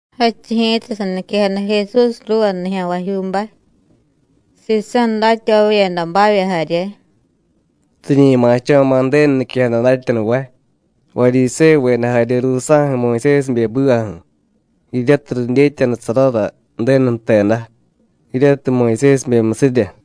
Jadchiy ji̱ta saniquejada Jesús ruuva nijya̱nvajyuubay, sisa̱ datyavavyedabavya jarye: “Riñi ma̱cho̱ma̱ Ju̱denu niquejada datyanuvay, Varyisévuveda jarye ruusa̱ju̱ Muyusésibe ju̱bivaju̱, jiryatiy ridyetyanusarara Ju̱denu jteda jiryatiy Muyusésibemyusirya.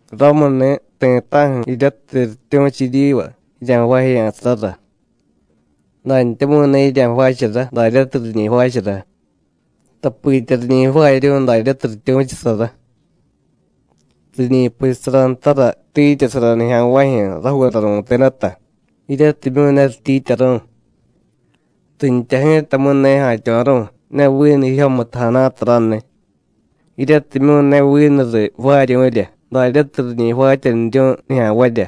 Ramuni̱, ti̱ta̱ju̱ jiryatiy rityu̱chu jiryiva jirya̱jvaajeya̱sarara, dantyamu̱y ne jirya̱jvaachara daryatiy riñi jvaachara, tapitya riñi jvaaryu̱y daryatiy rityu̱chusara. Riñi puchusara ntara tiityasara nijya̱nvajyu̱ rajuura ru̱tedata, jiryatimyu̱ ne rityiityaru̱y, rintya ji̱tamu̱y ne ja̱tyo̱ru̱y ne vinu jijyomutu jana̱ta raniy, jiryatimyu̱ ne vinu riy jvaaryu̱rya daryatiy riñi jvaatyaniryu̱y nijya̱nvarya.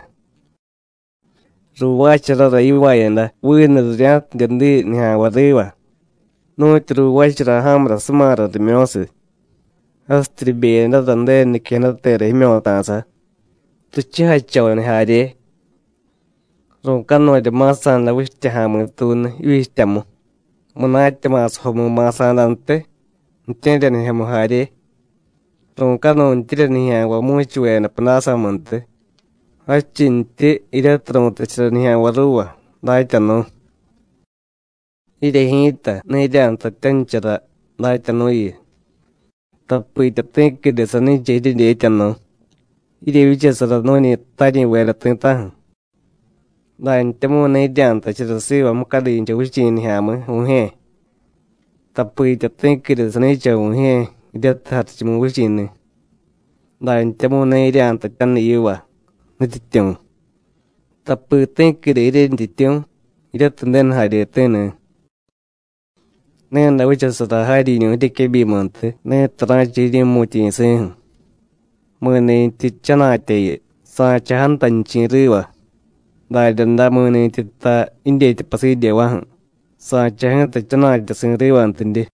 Ruuvaacharara yivaayada vinu rirya̱tidye diy nijya̱nvay riva, nu̱tyu ruuvaachara ja̱murasumara rimyo̱siy, jasityi ribeyadara Ju̱denu niquejadatera jimyo̱ta̱sa, richujachoniy jarye. Ru̱canurya ma̱sa̱da vichtya ja̱mi̱tuunu jivyichtyamu, munatya ma̱sajomu ma̱sa̱dantiy, ju̱tye̱ryanijyomu jarye. Ru̱canuntyirya nijya̱nvay mu̱chuveda pudásamuntiy, jadchintyi jiryatiy ru̱tachara nijya̱nvay ruuva: Datyanu̱. Jirye ji̱ta, ne jirya̱jtatyanichara Datyanu̱yu, tapitya ti̱quide sani̱cha jiryedyetyanu̱. Jiryevyichasara nu̱ñi taryi̱veda ti̱ta̱ju̱. Dantyamu̱y ne jirya̱jtachara siva mucadincha vichi̱ nijya̱mi̱, Vu̱jye̱, tapitya ti̱quide sani̱cha Vu̱jye̱, jiryatiy Jarichumuvichi̱ni̱. Dantyamu̱y ne jirya̱jtatyaniy yiva: Nutyityu̱, tapi ti̱quide jiryentyityu̱, jiryatiy Ju̱denu jaryeti̱ni̱. Ni̱day vichasara jaryiñu̱ jiryequebyimuntiy, ni̱tiy ra̱cha jiryi̱mu̱tyi̱si̱ju̱. Mi̱ni̱tyi jchana̱tyayu, sa̱cha jantanichi̱ riva, daryaday mi̱ni̱tyi jtay jidyetya pasidyeva̱ju̱, sa̱cha ji̱ta jchana̱tyasi̱ rivantidye.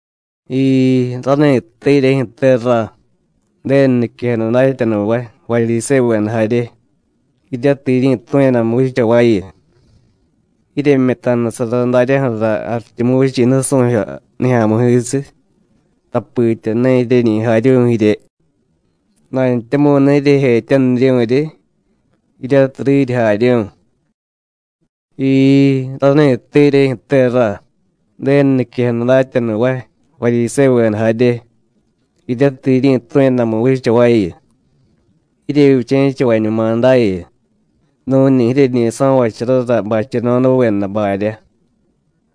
¡Jiii, rani̱tte jiryejyu̱te, ra, Ju̱denu niquejada datyanuvay, Varyisévuveda jarye, jiryatiy jiryi̱tu̱yadamu vichaváyu! Jiryemyutanusara daryaju̱ra Jarichumuvichi̱ nusu̱jyo nijya̱mi̱jisiy, tapitya ne jiryeñi jaryu̱y jirye, dantyamu̱y ne jiryejetyaniryu̱ryi, jiryatiy riryi jaryu̱y. ¡Jiii, rani̱tte jiryejyu̱te, ra, Ju̱denu niquejada datyanuvay, Varyisévuveda jarye, jiryatiy jiryi̱tu̱yadamu vichaváyu! Jiryevyiché̱chavañuma dayu, nu̱ñi jiryeñi so̱vacharara bacheno̱daveda barya,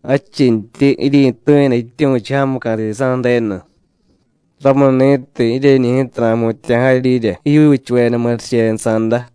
jadchintyi jiryi̱tu̱yada jityu̱chu jamuca̱ sisa̱ Ju̱denu. Ramuni̱tiy, jiryeñi̱ ji̱ta ra̱jmutya̱ jaryirya jijyuuchuveda murichenusa̱da.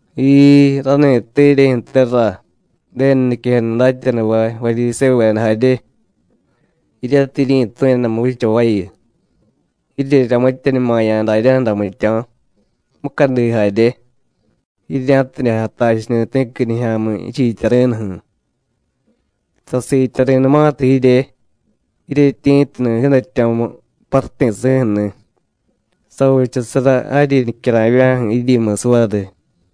¡Jiii, rani̱tte jiryejyu̱te, ra, Ju̱denu niquejada datyanuvay, Varyisévuveda jarye, jiryatiy jiryi̱tu̱yadamu vichavayu! Jirye ramityeñumaya̱ daryaju̱ra jmityo̱, mucadi jarye, jirya̱tidye jatachuni̱ ti̱qui nijya̱mi̱ jichiityari̱nuju̱. Sasiityari̱numatiy jirye, jiryetyi̱tunu jiidatyo̱mu paruti̱si̱ju̱ni̱, savichasara jaryi nicyara̱vya̱ju̱ jiryimusiy variy.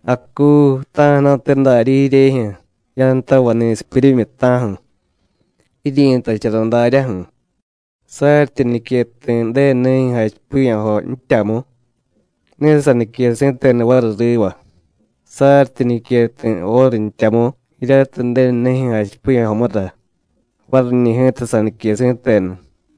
¡Acuu, ta̱ju̱na̱te darya jiryejyu̱ jiyantavay ni̱sipyuryimyi, ta̱ju̱! Jiryi̱tachara daryaju̱: Saryityi nique ti̱ Ju̱denunijyu̱ jachipiya̱jo jtyamu, ne sanique si̱tenu variy riva; saryityi nique ti̱ óru jtyamu jiryatiy Ju̱denunijyu̱ jachipiya̱jomura, variñi̱ ji̱ta sanique si̱tenu.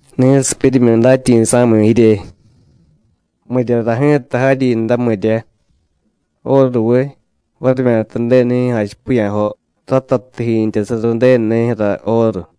¡Ni̱sipyuryimyi datyi̱sa̱miy jirye! ¿Miryara ji̱ta jaryinra, mirya? ¿Óruviy, varimyata Ju̱denu nijyu̱ jachipiya̱jo, ratatiy jiintyasara Ju̱denu nijyu̱ra óru?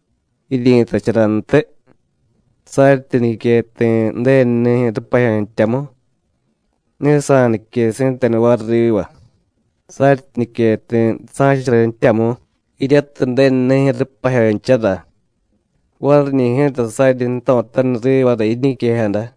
Jiryi̱tacharantiy: Saryityi nique ti̱ Ju̱denu nijyu̱ rupajyo jtyamu, ne sanique si̱tenu variy riva; saryityi nique ti̱ sa̱chara jtyamu, jiryatiy Ju̱denu nijyu̱ rupajyonchara, variñi̱ ji̱ta saryi jto̱taniy rivara jiñiquejada.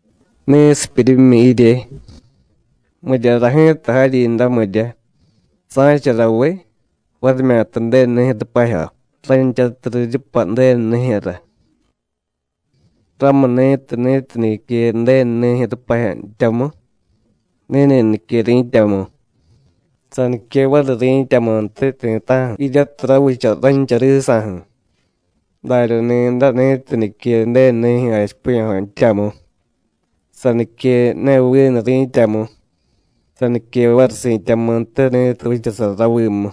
¡Ni̱sipyuryimyi jirye! ¿Miryara ji̱ta jaryinra, mirya? ¿Sa̱charaviy, varimyata Ju̱denunijyu̱ rupajyo, ranchatiy riryupay Ju̱denunijyu̱ra? Ramuni̱tiy, ni̱tiy nique Ju̱denunijyu̱ rupajyo jtyamu, ni̱ni̱ nique ri̱tyamu, sanique variy ri̱tyamuntiy ti̱ta̱ju̱ jiryatiy ravicha rancha risa̱ju̱. Darya ni̱day, ni̱tiy nique Ju̱denu nijyu̱ jachipiya̱jo jtyamu, sanique ne vinu ri̱tyamu, sanique variy si̱tyamuntiy ni̱tiy vichasara ravimu.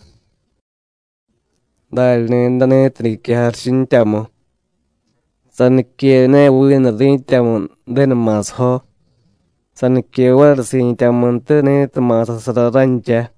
Darya ni̱day, ni̱tiy nique jarichu jtyamu, sanique ne vinu ri̱tyamu Ju̱denu ma̱sajo, sanique variy si̱tyamuntiy ni̱tiy ma̱sasara rancha.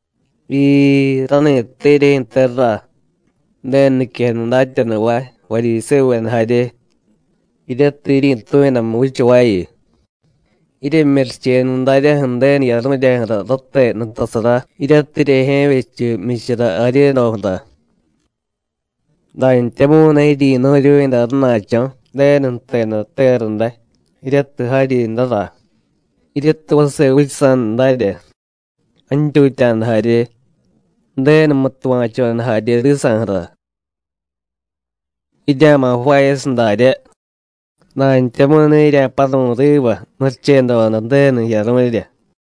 ¡Jiii, rani̱tte jiryejyu̱te, ra, Ju̱denu niquejada datyanuvay, Varyisévuveda jarye, jiryatiy jiryi̱tu̱yadamu vichavayu! Jiryemyurichenu daryaju̱ Ju̱denu jiyaru̱ryaju̱ra rate nutasara, jiryatiy jiryejye̱vyechu jmyichara jaryedoju̱ra, dantyamu̱y ne jiryi̱nu̱ryu̱yada rana̱cho̱ Ju̱denu jteda tera day, jiryatiy jaryinrara, jiryatiy vase vichasa̱da darya, jantyutya̱da jarye, Ju̱denumu tuva̱choda jarye risa̱ju̱ra. Jirya̱ma̱ jvaayasiy daryá, dantyamu̱y ne jirya̱paru̱y riva murichedoda Ju̱denu jiyaru̱rya.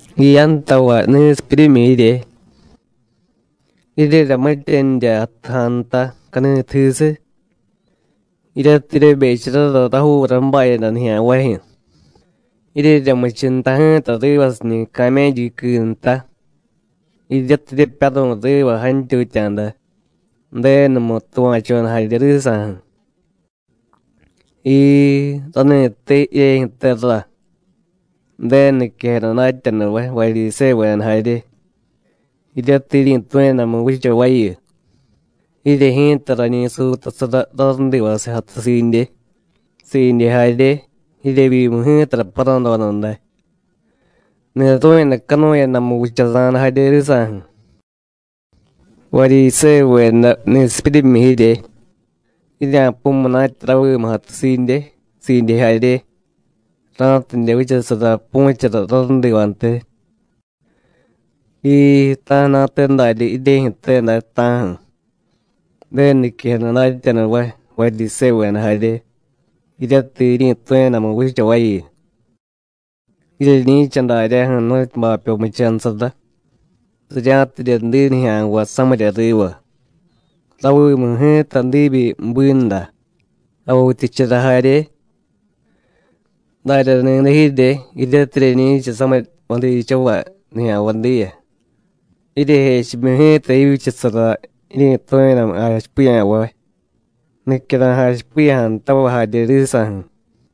¡Jiyantavay ni̱sipyuryimyi jirye! ¡Jirye ramityanirya ja̱ nta cani̱tujisiy, jiryatiy jiryebecharara rajuura ju̱bayada nijya̱nvajyu̱, jiryeryamichu nta ji̱ta rivasiñi̱ camélluqui nta, jiryatiy jiryepyaru̱y riva jantyutya̱da, Ju̱denumu tuva̱choda jarye risa̱ju̱! ¡Jiii, rani̱tte jiryejyu̱te, ra, Ju̱denu niquejada datyanuvay, Varyisévuveda jarye, jiryatiy jiryi̱tu̱yadamu vichavayu! Jirye ji̱ta rañi suutasara rarudivasiy jatusiidye, siidye jarye, jiryevyimu ji̱tara paradoda day, ni̱ru̱yadacanuyadamu vichasa̱da jarye risa̱ju̱. ¡Varyisévuveda ni̱sipyuryimyi jirye! Jirya̱pu̱y munatya ravimu jatusiidye, siidye jarye, ra̱tidye vichasara pu̱chara rárudivantiy. ¡Jiii, ta̱ju̱na̱te darya jiryejyu̱te day, ta̱ju̱, Ju̱denu niquejada datyanuvay, Varyisévuveda jarye, jiryatiy jiryi̱tu̱yadamu vichavayu! Jiryeñi̱cha daryaju̱ nu̱tyu bapyo muchanusara, rirya̱tidye diy nijya̱nvay samirya riva. Ravimu ji̱ta diibyi binda, javityichara jarye. Darya ni̱day jirye, jiryatiy jiryeñi̱cha samiy jvadichavay nijya̱nvay diya, jiryejechimyu ji̱ta jivyichasara jiryi̱tu̱yadamu jachipiya̱vay, nicyara̱y jachipiya̱jadatavay jarye risa̱ju̱.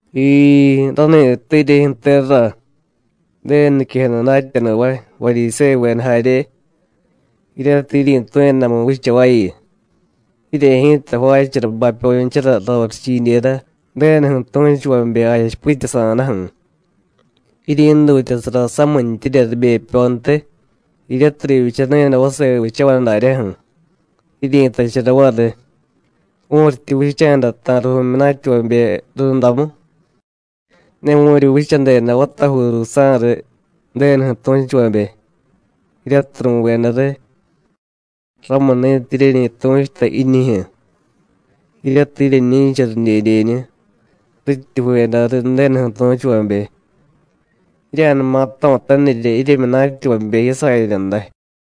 ¡Jiii, rani̱tte jiryejyu̱te, ra, Ju̱denu niquejada datyanuvay, Varyisévuveda jarye, jiryatiy jiryi̱tu̱yadamu vichavayu! Jirye ji̱ta jvaachara bapyonchara rorichidyera, Ju̱denuju̱ tu̱chuvabe jachipityasa̱daju̱, jiryi̱dutyasara samintyirya ribepyontiy, jiryatiy rivyichanu̱yada vase vichavay daryaju̱, jiryi̱tachara variy: Vu̱ryityi vicha̱da ta̱riy vu̱myunatyavabe rundamu, ne vu̱ryi vichadeda vatajuu ruusa̱riy Ju̱denuju̱ tu̱chuvabe, jiryatiy ru̱veda riy. Ramuni̱tiy jiryeñi tu̱chuta jiñijyu̱, jiryatiy jiryeñi̱cha ridyedyeñu, rityi ju̱veda riy Ju̱denuju̱ tu̱chuvabe. ¡Jirya̱numa jto̱tanirya jiryemyunatyavabe jiyasayada day!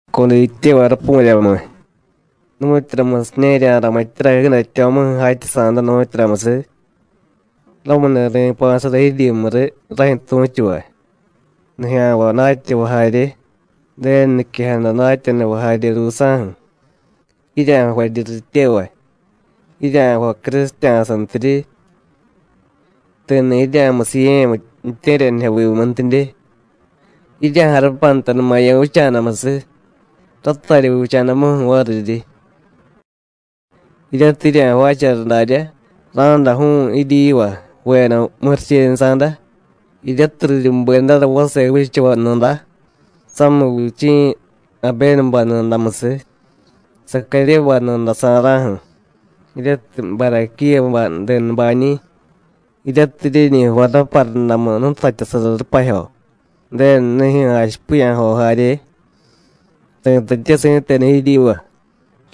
¡Codityevay rapu̱ryamiy! ¿nu̱tyuramusiña̱ jirya̱ramityara jiidatyo̱muju̱ jatyasa̱da, nu̱tyuramusiy? Ramuni̱ ri̱pa̱sara jiryimu riy rajyu̱ tu̱chuvay, nijya̱nvay datyavay jarye, Ju̱denu niquejada datyanuvay jarye ruusa̱ju̱. Jirya̱jvaryi rityevay, jirya̱jvay crusitya̱santiryi; ti̱ni̱ jirya̱musiye̱ ju̱tye̱ryanijyovimuntidye, jirya̱jarupantanumaya̱ vicha̱damusiy, ratarya vicha̱damuju̱ variryi. Jiryatiy jirya̱jvaachara daryá, ra̱day ju̱u̱y jiryiva ju̱veda murichenusa̱da, jiryatiy riryubedara vase vichavay nuda, samiy vichi̱ Abénubay nudamusiy, Sacaryébay nuda sa̱ra̱ju̱, jiryatiy Baraquíyabay denubañi̱, jiryatiy jiryeñi jvay raparudamu jnutatyasara rupajyo, Ju̱denu nijyu̱ jachipiya̱jo jarye. Ri̱tatye si̱tenu jiryiva: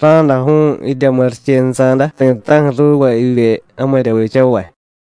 Ra̱day ju̱u̱y jirya murichenusa̱da ti̱ta̱ju̱ ruuva jivye jamirya vichavay.”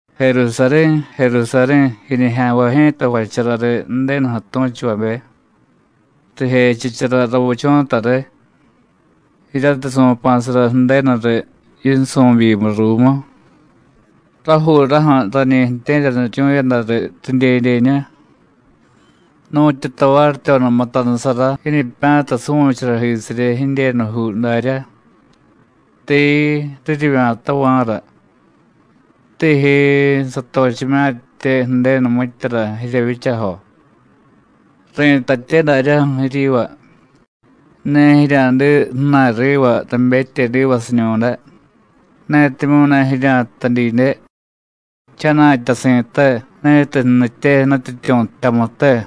“Jerusarí̱, Jerusarí̱, jiñijya̱nvay ji̱ta jvachara riy Ju̱denuju̱ tu̱chuvabe, rijechichara ravichu̱ta riy, jiryatiy su̱pa̱sara Ju̱denu riy yinsu̱byimiy ruumu. Rajuuraju̱ rañi ju̱tye̱ryaniryu̱yada riy ridyedyeñu, nu̱tyu tavaryityoda mutanusara jiñipya̱ta suvu̱charajisiryi jidyenujuu darya; tiii, riryivya̱tava̱ra. ¡Tíjyiii, satochimye̱ttye Ju̱denu mityara jiryevyichajo! Ri̱tatye daryaju̱ jiryiva: Ne jirya̱diy ju̱na̱y riva rabetyedivasiñu̱day, netimyu̱ ne jirya̱jtay didye: ¡Jchana̱tyasi̱te ni̱tiy jnitye Nutyityu̱ jtyamute!”